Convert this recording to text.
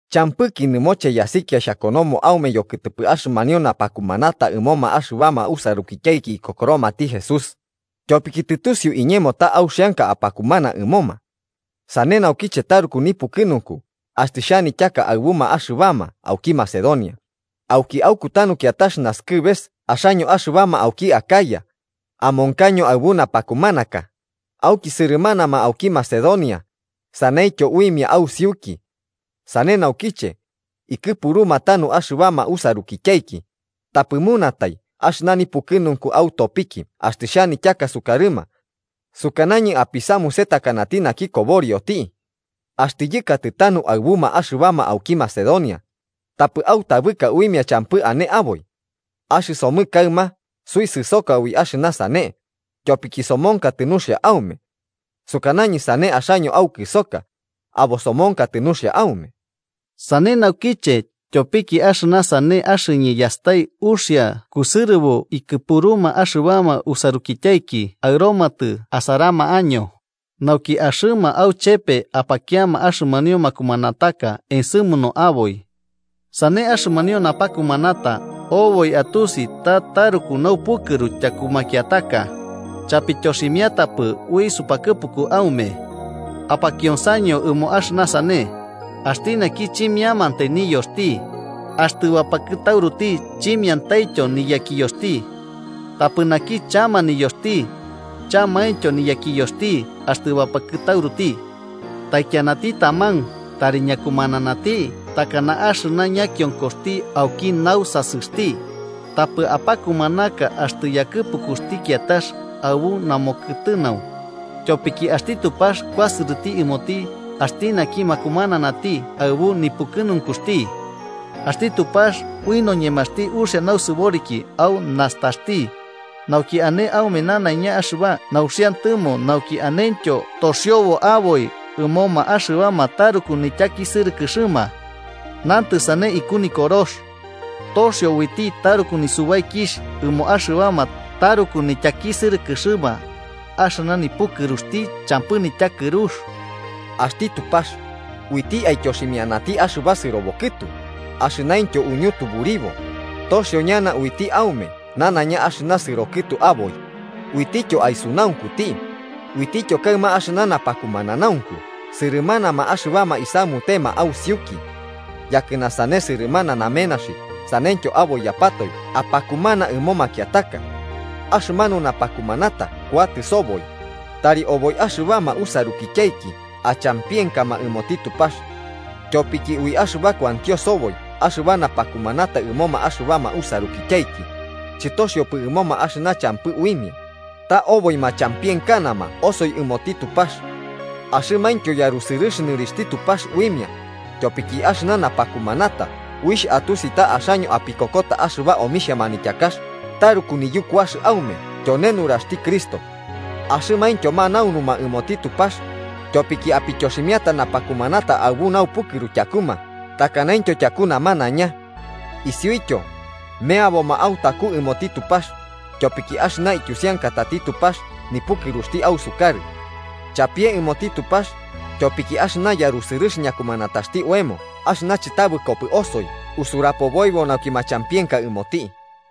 Champɨki nɨmoche yasikia xhakonomo aume yokɨtɨpɨ axɨmanio napakumanata ɨmoma axɨbama usarukityaiki ikokoromati Jesús, tyopiki tɨtusiu iñemo ta auxianka apakumana ɨmoma. Sane naukiche taruku nipukɨnunku axtɨ xhanityaka aɨbuma axɨbama auki Macedonia, auki aukutanu kiatax nasɨkɨbeka axaño axɨbama auki Acaya amonkaño aɨbu napakumanaka, auki sɨrɨmanama auki Macedonia saneityo uimia ausiuki. Sane naukiche, ikɨpuruma tanu axɨbama usarukityaiki, tapɨ munatai axɨna nipukɨnunku autopiki axtɨ xhanityaka sukarɨma. Sukanañɨ apisamuse takanati naki koborioti. Axtɨ yɨkatɨ tanu aɨbuma axɨbama auki Macedonia, tapɨ autabɨka uimia champɨ ane aboi. Axɨsomɨ kaɨma suisɨsoka ui axɨna sane, tyopiki somonkatɨ nuxia aume. Sukanañɨ sane axaño aukɨsoka, abo somonkatɨ nuxia aume. Sane naukiche tyopiki axɨna sane axɨñɨ yastai uxia kusɨrɨbo ikɨpuruma axɨbama usarukityaiki aɨromatɨ asarama año, nauki axɨma auchepe apakiama axɨmanio makumanataka ensɨmunu aboi. Sane axɨmanio napakumanata oboi atusi ta taruku naupukɨru tyaku makiataka, chapityoximiatapɨ ui supakɨpuku aume. Apakionsaño ɨmo axɨna sane: Axti naki chimiantai niyoxti, axtɨ bapakɨtauruti chimiantaityo niyakiyoxti. Tapɨti naki chama niyoxti, chamaintyo niyakiyoxti axtɨ bapakɨtauruti. Taikianati taman tari ñakumananati takana axɨna ñakionkoxti auki nausasɨxti, tapɨ apakumanaka axtɨ yakɨpukuxti kiatax aɨbu namokɨtɨnau, tyopiki axti Tupax kuasɨrɨti ɨmoti axti naki makumananati aɨbu nipukɨnunkuxti. Axti Tupax ui noñemaxti uxia nausɨboriki au nastaxti, nauki ane aume nanaiña axɨba nauxiantɨmo nauki anentyo toxiobo aboi ɨmoma axɨbama taruku nityakisɨrɨkɨxɨma. Nantɨ sane iku Nikorox: “Toxio uiti taruku nisubaikixh ɨmo axɨbama taruku nityakisɨrɨkɨxɨma, axɨna nipukɨruxti champɨ nityakɨrux.” Axti Tupax, uiti aityoximiati axɨba sɨrobo kɨtu, axɨnaintyo uñutuburibo, toxio ñana uiti aume nanaiña axɨna sɨrobo kɨtu aboi, uitityo aisunaunkuti, uitityo kaɨma axɨna napakumananaunku sɨrɨmanama axɨbama isamutema ausiuki. Yakɨna sane sɨrɨmana namenaxi saneityo aboiyapatoe apakumana ɨmo makiataka. Axɨmanu napakumanata kuatɨ soboi, tari oboi axɨbama usarukityaiki achampienkama ɨmoti Tupax. Tyopiki ui axɨna kuantio soboi axɨba napakumanata ɨmoma axɨbama usarukityaiki, chɨtoxiopɨ ɨmoma axɨna champɨ uimia, ta oboi machampienkanama osoi ɨmoti Tupax. Axɨmaintyo yarusɨrɨx nɨrixhti Tupax uimia, tyopiki axɨna napakumanata uixh atusi ta axaño apikokota axɨba omixhia manityakax taruku niyukuax aume tyone nuraxti Cristo. Axɨmaintyo manaunuma ɨmoti Tupax tyopiki apityoximiata napakumanata aɨbu naupukɨru tyakuma takanaintyo tyaku namanaiña. Isiuityo, meaboma autaku ɨmoti Tupax, tyopiki axɨna ityusiankatati Tupax nipukɨruxti ausukarɨ. ¡Chapie ɨmoti Tupax, tyopiki axɨna yarusɨrɨx ñakumanataxti oemo axɨna chɨtabɨkopɨ osoi usurapoboibo nauki machampienka ɨmoti!